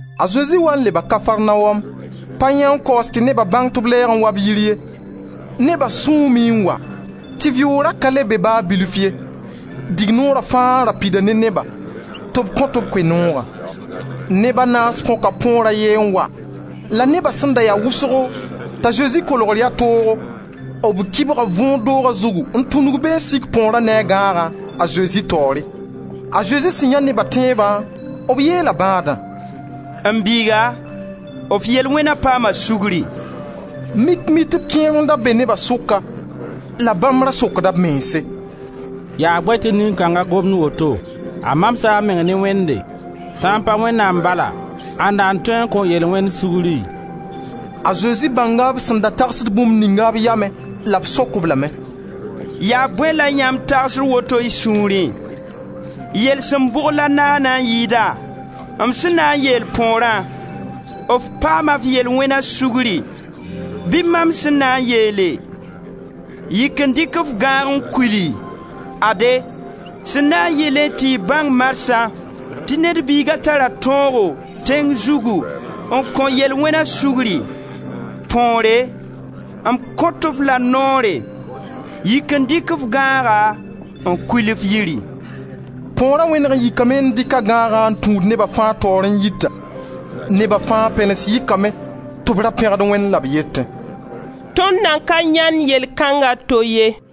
A Zezi waa n leba Kafarnaom. Pa yãee n kaoos tɩ neba bãng tɩ b lɛɛg n waa b yiri ye. Neba sũume n wa, tɩ vɩʋʋg ra ka le be ba bilf ye. Dignoora fãa ra pida ne neba, tɩ b kõt-b Koe-noogã. Neb a naas põka põor a ye n wa. La neba sẽn da ya wʋsgo, t'a Zezi kolgr ya toogo, b kɩbga võor doga zugu n tũnug be n sik põora ne a gãagã a Zezi taoore. A Zezi sẽn yãe neba tẽebã, b yeela bãadã: «M biiga, f yel-wẽna paama sugri.» Mik Mitb kẽer n da be neba sʋka la bãmb ra sokda b mense: «Yaa bõe tɩ nin-kãnga gomd woto? A mamsa a meng ne Wẽnde! Sã n pa Wẽnnaam bala, ãnda n tõe n kõ yel-wẽnd sugri?» A Zezi bãnga b sẽn da tagsd bũmb ninga b yamẽ la b sok-b lame: «Yaa bõe la yãmb tagsd woto y sũurẽ? Yelsem bʋg la naana n yɩɩda, m sẽn na n yeel põorã: f paama f yel-wẽna sugri bɩ mam sẽn na n yeele: yik n dɩk f gãag n kuli? Ade, sẽn na n yɩlẽ tɩ y bãng marsã tɩ Ned Biiga tara tõogo, tẽng zugu, n kõ yel-wẽna sugri, põore, m kõt f la noore: yik n dɩk f gãaga n kul f yiri.» Põora wẽneg n yikame n dɩk a gãag n tũud neba fãa taoore n yita. Neba fãa pɛlens yikame tɩ b ra pẽgd Wẽnd la b yetẽ: «Tõnd nan ka yãend yell kãnga to ye.»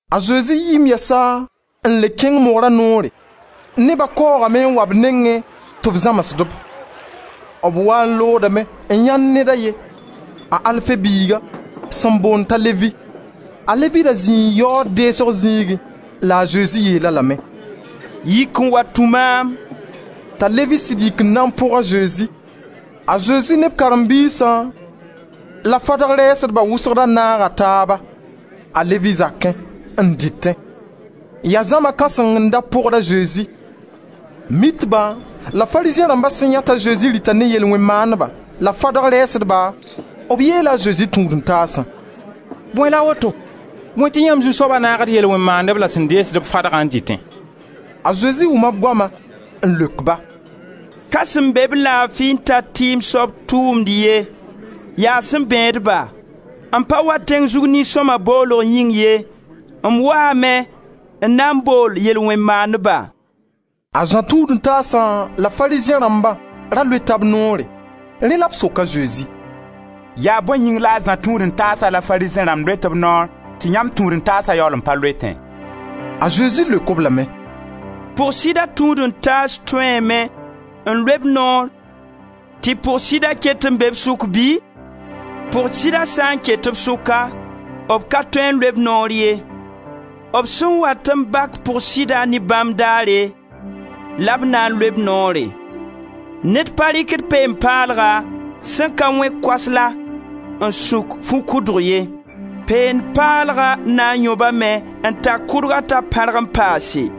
A Zezi yiime yɛsa n le kẽng mogra noore; neba kaoogame n wa b nengẽ tɩ b zãmsd-b. B waa n loodame n yãend ned a ye, a Alfe biiga, sẽn boond t'a Levi. A Levi da zĩi yaood deesg zĩigẽ la a Zezi yeel-a lame: «Yik n wa tũ maam!» T'a Levi sɩd yik n na n pʋg a Zezi. A Zezi ne b karen-biisã la Farizẽ rãmb wʋsg da naaga taaba, a Levi zakẽ, n dɩtẽ. Yaa zãma kãseng n da pʋgd a Zezi. Mitba la Farizẽ rãmba sẽn yãe t'a Zezi rɩta ne yel-wẽn-maandba la fadga rɛɛsdba, b yeela a Zezi tũud-n-taasã: «Bõe la woto? Bõe tɩ yãmb zu-soaba naagd yel-wẽn-maandb la sẽn deesd-b fadgã n dɩtẽ?» A Zezi wʋma b goama n leok ba: «Ka sẽn be-b laafi n tar tɩɩm soab tʋʋmd ye, yaa sẽn bẽed-ba. M pa wa tẽng zug nin-sõma boolg yĩng ye, m waame n na n bool yel-wẽn-maandba.» A Zã tũud-n-taasa la Farizẽ rãmba ra loeta b noore; rẽ la b sok a Zezi: «Yaa bõe yĩng la a Zã tũud-n-taasa la Farizẽ rãmb loet b noor tɩ yãmb tũud-n-taasa yaool n pa loetẽ?» A Zezi leok-b lame: «Pʋg-sɩda tũud-n-taas tõeeme, n loe b noor tɩ pʋg-sɩda ket n be b sʋk bɩ? Pʋg-sɩda sã n ket b sʋka, b ka tõe n loe b noor ye. B sẽn wat n bak pʋg-sɩda ne bãmb daare, la b na n loe b noore. Ned pa rɩkd peen-paalga sẽn ka wẽ koasla n sũk fu-kʋdg ye. Peend paalga na n yõbame n tak kʋdgã t'a pãrg n paase.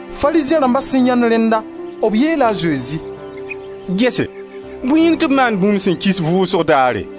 Farizẽ rãmba sẽn yãend rẽnna b yeela a Zezi: «Gese, bõe yĩng tɩ b maand bũmb sẽn kis, vʋʋsg daare?»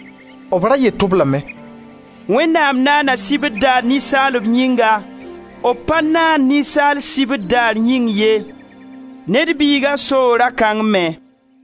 B ra yet-b lame: «Wẽnnaam naana sibr daar ninsaalb yĩnga. B pa naan ninsaal sibr daar yĩng ye. Ned Biiga soo ra kãng me.»